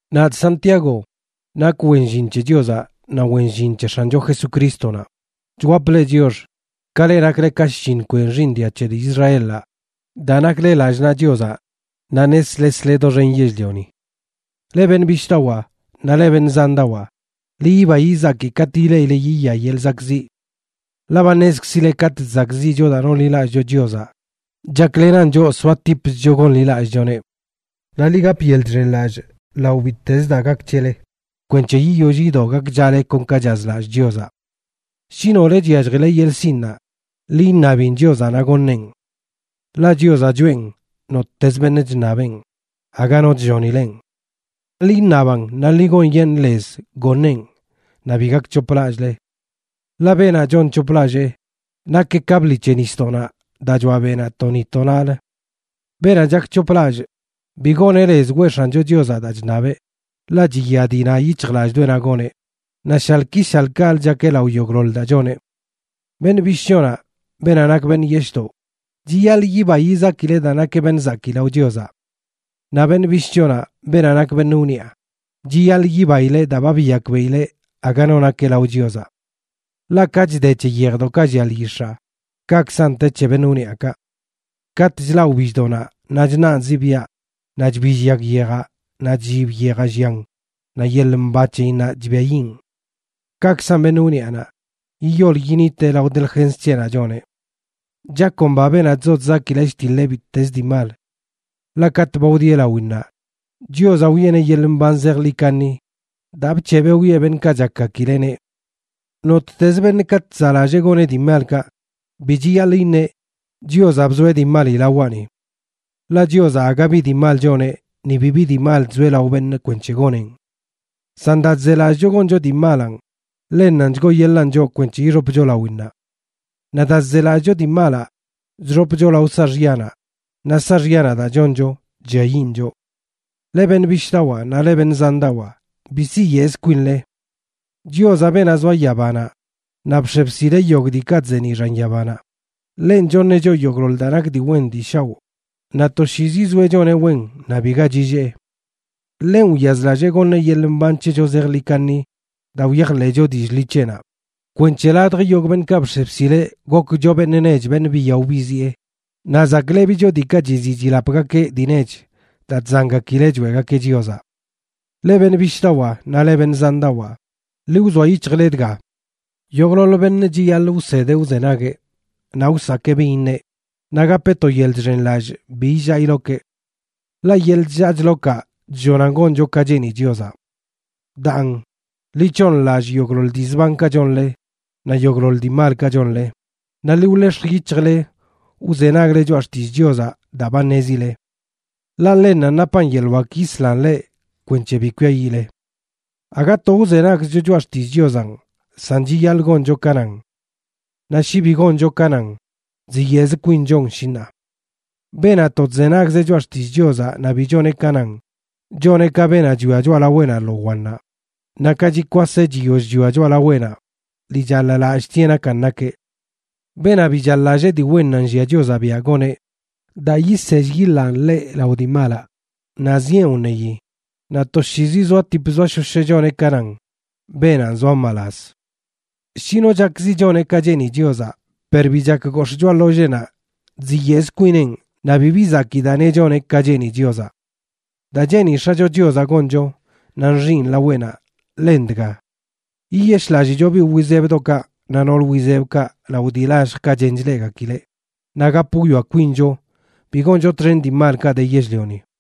Nadꞌ Santiago,a nongakeꞌ nakꞌ wen llin c̱he Chiozaꞌ naꞌ wen llin c̱he X̱ancho Jesucrístonaꞌ, chwapꞌ leꞌ chiox, ka leꞌ nakle ka shlliṉ kwen xiiṉ dia c̱he dii Israelaꞌ daa nakle lallꞌ naꞌ Chiozaꞌ naꞌ neslesle doxen yell-lioni. Leꞌ beṉꞌ bishꞌdawaa naꞌ leꞌ beṉꞌ zandawaa, ḻi yiba yizaki katꞌ ileꞌile yiya yeḻꞌ zakꞌziꞌ. Ḻaꞌ ba ṉezkzile katꞌ chzakꞌziꞌcho daa nonḻilallꞌcho Chiozaꞌ, chaklenan choꞌ soatipchcho gonḻilallꞌchoneꞌ. Naꞌ ḻi gap yeḻꞌ chxenlallꞌ lao bittez daa gak c̱hele kwenc̱he yiyoll yido gakchale kon ka chazlallꞌ Chiozaꞌ. Shi nole chyalljile yeḻꞌ sinꞌnaꞌ, ḻi iṉabin Chiozaꞌ naꞌ goṉeꞌn. Ḻaꞌ Chiozaꞌ choꞌen nottezə beṉꞌ chṉabeꞌn, aga no chllonileꞌn. Ḻi iṉaban naꞌ ḻi gonyeṉꞌ lez goṉeꞌn naꞌ bi gakc̱hoplallꞌle. Ḻaꞌ beenaꞌ chonc̱hoplallꞌ nakeꞌ ka bḻi c̱he nisdoꞌnaꞌ daa choaꞌ beꞌnaꞌ to ni to naꞌlə. Beenaꞌ chakc̱hoplallꞌ, bi goneꞌ lez weꞌ X̱ancho Chiozaꞌ daa chṉabeꞌ, ḻaꞌ chiya dii na yic̱hjlallꞌdoꞌenaꞌ goneꞌ, naꞌ shaḻꞌ ki shaḻꞌ kaꞌlə chakeꞌ lao yogꞌḻoḻ daa choneꞌ. Beṉꞌ bishꞌchonaꞌ, beenaꞌ nak beṉꞌ yeshꞌdoꞌ, chiyaḻꞌ yiba yizakileꞌ daa nakeꞌ beṉꞌ zakii lao Chiozaꞌ. Naꞌ beṉꞌ bishꞌchonaꞌ, beenaꞌ nak beṉꞌ wniꞌa, chiyaḻꞌ yibaileꞌ daa ba biyakbeꞌileꞌ aga no nakeꞌ lao Chiozaꞌ. Ḻaꞌ ka chde c̱he yejdoꞌkaꞌ llia lyix̱aa kaꞌkzan te c̱he beṉꞌ wniꞌakaꞌ. Katꞌ chlaꞌ wbilldoꞌnaꞌ naꞌ chṉaꞌn ziꞌbiaꞌ naꞌ chbill yag yejaꞌ, naꞌ chllib yejaꞌ llian naꞌ yeḻꞌ mba c̱heyinnaꞌ chbiayiꞌn. Kaꞌkzan beṉꞌ wniꞌanaꞌ, yiyol yiniteꞌ lao delgens c̱heꞌnaꞌ choneꞌ. Chakomba beenaꞌ chzo chzaki chtiḻeꞌ bittez dii mal. Ḻaꞌ katꞌ ba wdieꞌ lawinnaꞌ, Chiozaꞌ wiꞌeneꞌ yeḻꞌ mban zejḻi kaṉi daa bc̱hebeꞌ wiꞌe beṉꞌkaꞌ chakgakileꞌneꞌ. Nottez beṉꞌ katꞌ chzaꞌlallee goneꞌ dii malkaꞌ, bi chiyaḻꞌ iṉeꞌ: “Chiozaꞌ bzoeꞌ dii mali lawaꞌni”. Ḻaꞌ Chiozaꞌ aga bi dii mal choneꞌ ni bibi dii mal chzoeꞌ lao beṉꞌ kwenc̱he goneꞌn. San daa chzelallꞌcho goncho dii malanꞌ, ḻennanꞌ chgooyeḻaan choꞌ kwenc̱he ixopcho lawinnaꞌ. Naꞌ daa chzelallꞌcho dii malaꞌ, chxopcho lao saaxyanaꞌ, naꞌ saaxyanaꞌ daa choncho chlliayiꞌn choꞌ. Leꞌ beṉꞌ bishꞌdawaa naꞌ leꞌ beṉꞌ zandawaa, bi siyeꞌz kwinle. Chiozaꞌ, beenaꞌ zoa yabanaꞌ naꞌ bx̱e bsileꞌ yogꞌ diikaꞌ chzeeniꞌ xan yabanaꞌ, ḻenꞌ choṉeꞌ choꞌ yogꞌḻoḻ daa nak dii wen dii shaoꞌ naꞌ toshiizi zoeꞌ choneꞌ wen naꞌ biga chillee. Ḻenꞌ wyazlallee goṉeꞌ yeḻꞌ mban c̱hecho zejḻi kaṉi daa wyajḻeꞌcho dillꞌ ḻi c̱heꞌnaꞌ, kwenc̱he ladj yogꞌ beṉꞌkaꞌ bx̱e bsileꞌ gokcho beṉꞌ nech beṉꞌ biyaꞌo biziꞌe, naꞌ zaklebicho diikaꞌ chiziꞌ chilapgakeꞌ dii nech daa chzangakileꞌ choeꞌgakeꞌ Chiozaꞌ. Leꞌ beṉꞌ bishꞌdawaa naꞌ leꞌ beṉꞌ zandawaa, ḻi wzoa yic̱hjle dga: yogꞌḻoḻ beṉꞌ chiyaḻꞌ wsedeꞌ wzenagueꞌ, naꞌ wsakee bin iṉeꞌ, naꞌ gapeꞌ to yeḻꞌ chxenlallꞌ bi illaa ilokeꞌ. Ḻaꞌ yeḻꞌ chllaa chlokaꞌ chllonan goncho ka cheeni Chiozaꞌ. Daan, ḻi c̱hooṉlallꞌ yogꞌḻoḻ dii zbankaꞌ chonle naꞌ yogꞌḻoḻ dii malkaꞌ chonle, naꞌ ḻi wḻex̱j yic̱hjle wzenagle choꞌa xtillꞌ Chiozaꞌ daa ba ṉezile. Ḻaꞌ ḻennanꞌ napan yeḻꞌ wak yislan leꞌ kwenc̱he bi kwiayiꞌle. Aga to wzenagzcho choꞌa xtillꞌ Chiozanꞌ, san chiyaḻꞌ goncho ka nan. Naꞌ shi bi goncho ka nan, chziyeꞌzə kwinchon, shi ṉaa. Beenaꞌ to chzenagz choꞌa xtillꞌ Chiozaꞌ naꞌ bi choneꞌ ka nan, choneꞌ ka beenaꞌ chwia choꞌalaweꞌnaꞌ lo wannaꞌ, naꞌ ka chikwaseꞌ chiyoll chwia choꞌalaweꞌnaꞌ, ḻi chaḻ-lallꞌtieꞌ nakan nakeꞌ. Beenaꞌ bi chaḻ-lallꞌ dii wennaꞌ nllia Chiozaꞌ biaꞌ goneꞌ daa yisell yiḻaan ḻeꞌ lao dii malaꞌ, naꞌ zieꞌn wṉeyi, naꞌ toshiizi zoaꞌtip zoashosheꞌ choneꞌ ka nan, beenanꞌ zoa mbalaz. Shi no chakzi choneꞌ ka cheeni Chiozaꞌ, per bi chak gox̱ꞌ choꞌa ḻolleenaꞌ, chziyeꞌz kwinenꞌ naꞌ bibi zakii daa neꞌ choneꞌ ka cheeni Chiozaꞌ. Daa cheeni X̱acho Chiozaꞌ goncho naꞌ nxiꞌn laweꞌnaꞌ, ḻen dga: yiyeshꞌlallicho biꞌ wizebdoꞌkaꞌ naꞌ nool wizebkaꞌ lao dii lalljkaꞌ chen chleꞌgakileꞌ, naꞌ gap wwia kwincho bi goncho txen dii malkaꞌ de yell-lioni.